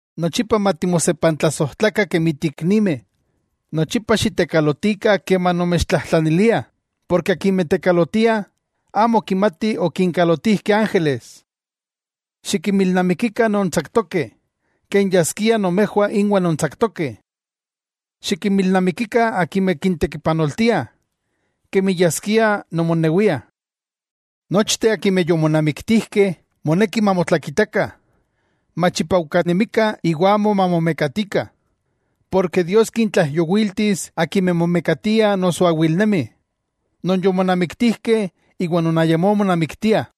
Nochipa matimosepantlasojtlakah kemi tiiknimeh. Nochipa xitekalotikah keman nomechtlajtlaniliah, porke akimeh tekalotiah, amo kimatih okinkalotijkeh ángeles. Xikinmilnamikikah non tsaktokeh, ken yaskia nomejwah inwah nontsaktokeh. Xikinmilnamikikah akimeh kintekipanoltiah, kemi yaskia nomonewiah. Nochteh akimeh yomonamiktijkeh moneki mamotlakitakah, machipaujkanemikah iwa amo mamomekatikah; porke Dios kintlaijyowiltis akimeh momekatiah noso awilnemi, non yomonamiktijkeh iwa non ayamó monamiktiah.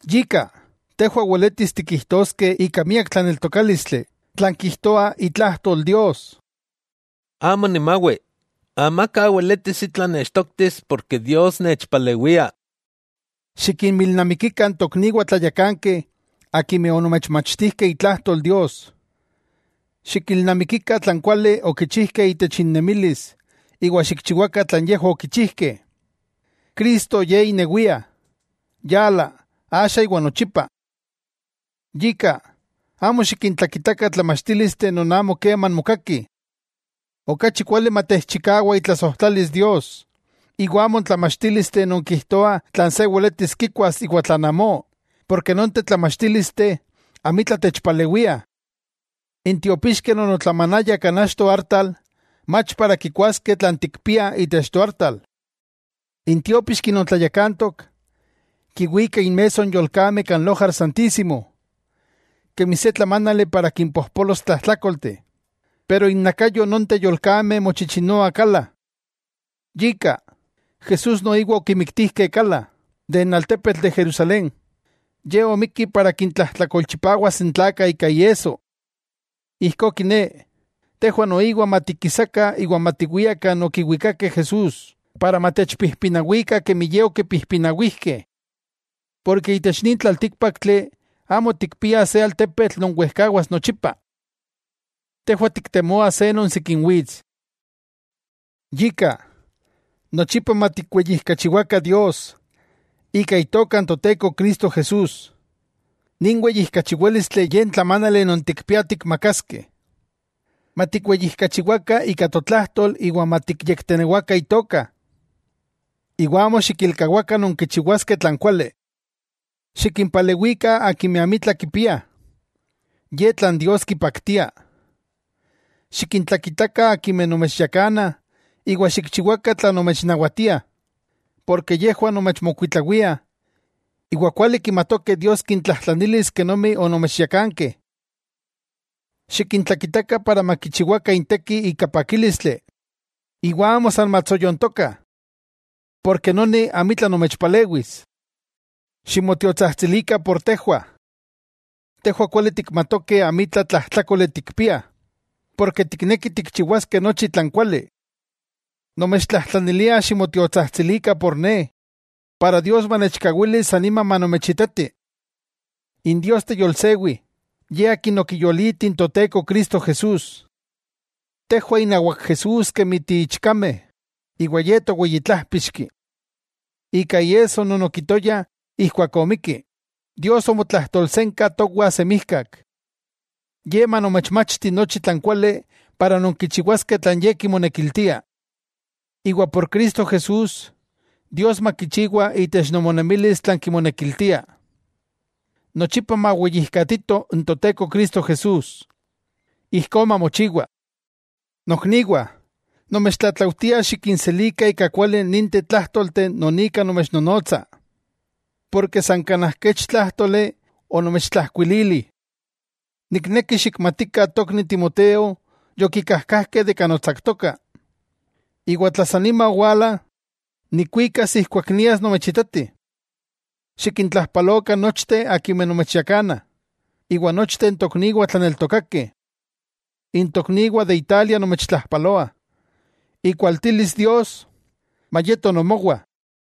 Yika, tejwah weletis tikijtoskeh ika miak tlaneltokálistli tlan kijtoa itlajtol Dios: Amo nimawi, amaka weletis itla nechtoktis porke Dios nechpalewia. Xikinmilnamikikah n tokniwah tlayakankeh akimeh onomechmachtijkeh itlajtol Dios, xikilnamikikah tlan kuali okichijkeh itech innemilis iwa xikchiwakah tlan yejwah okichijkeh. Cristo Ye inewia, yala, axa iwa nochipa. Yika, amo xikintlakitakah tlamachtílisteh non amo keman mokakih. Okachi kuali matechchikawa itlasojtlalis Dios, iwa amo n tlamachtílisteh non kijtoah tlan se weletis kikuas iwa tlan amó, porke nonteh tlamachtílisteh amitla techpalewiah. N tiopixkeh non otlamanayah kan achto artal, mach para kikuaskeh tlan tikpiah itech toartal. N tiópixki non tlayakantok, kiwika inmesso n yolkameh kan Lojar Santísimo, kemi se tlamánali para kimpojpolos tlajtlákolteh, pero innakayo nonteh yolkameh mochichinoa kala. Yika, Jesús noiwa okimiktijkeh kala, de n altepetl de Jerusalén, ye omikki para kintlajtlakolchipawas n tlakah ika iesso. Ijkó kiné, tejwah noiwah matikisakah iwa matiwiah kan okiwikakeh Jesús, para matechpijpinawikah kemi ye okipijpinawijkeh. Porke itech nin tlaltíkpaktli amo tikpiah se altepetl non wejkawas nochipa. Tejwah tiktemoah non sikin wits. Yika, nochipa matikweyijkachiwakah Dios, ika Itoka n Toteko Cristo Jesús, nin weyijkachiwálistli ye n tlamánali non tikpiah tikmakaskeh. Matikweyijkachiwakah ika totlajtol iwa matiktenewakah Itoka. Iwa amo xikilkawakah nonkichiwaskeh tlan kuali. Xikimpalewikah akimeh amitla kipiah, ye tlan Dios kipaktia. Xikintlakitakah akimeh nomechyakanah iwa xikchiwakah tlan nomechnawatiah, porke yejwah nomechmokuitlawia, iwa kuali kimatokeh Dios kintlajtlanis kenomi onomechyakankeh. Xikintlakitakah para makichiwakah intekih ika pakílistli, iwa amo san matsoyontokah. Porke noni amitla nomechpalewis. Ximotiotsajtsilikah por tejwah. Tejwah kuali tikmatokeh amitla tlajtlákoli tikpiah, porke tiknekih tikchiwaskeh nochi tlan kuali. Nomechtlajtlanilia ximotiotsajtsilikah por ne, para Dios manechkawili sanima manomechitati. N Dios teyolsewi, Ye akin okiyoliti n Toteko Cristo Jesús. Tejwah inawak Jesús kemi tiichkameh, iwa Ye Toweyi Tlájpixki. Ika iesso non okitoya ijkuak omikki, Dios omotlajtolsenka towa semijkak. Ye manomechmachti nochi tlan kuali para nonkichiwaskeh tlan Ye kimonekiltia. Iwa por Cristo Jesús, Dios makichiwa itech nomonemilis tlan kimonekiltia. ¡Nochipa maweyijkatito n Toteko Cristo Jesús! Ijkó mamochiwa. Nokniwah, nomechtlatlaujtia xikinselikah ika kuali ninteh tlájtolteh non ika nomechnonotsa, porke san kanaj kech tlájtoli onomechtlajkuilili. Nikneki xikmatikah tokni Timoteo yokikajkajkeh de kan otsaktoka, iwa tla sanima owala, nikuikas ijkuak nias nomechitati. Xikintlajpalokah nochteh akimeh nomechyakana, iwa nochteh n tokniwah tlaneltokakeh. N tokniwah de Italia nomechtlajpaloah. Ikualtilis Dios mayeto nomowa.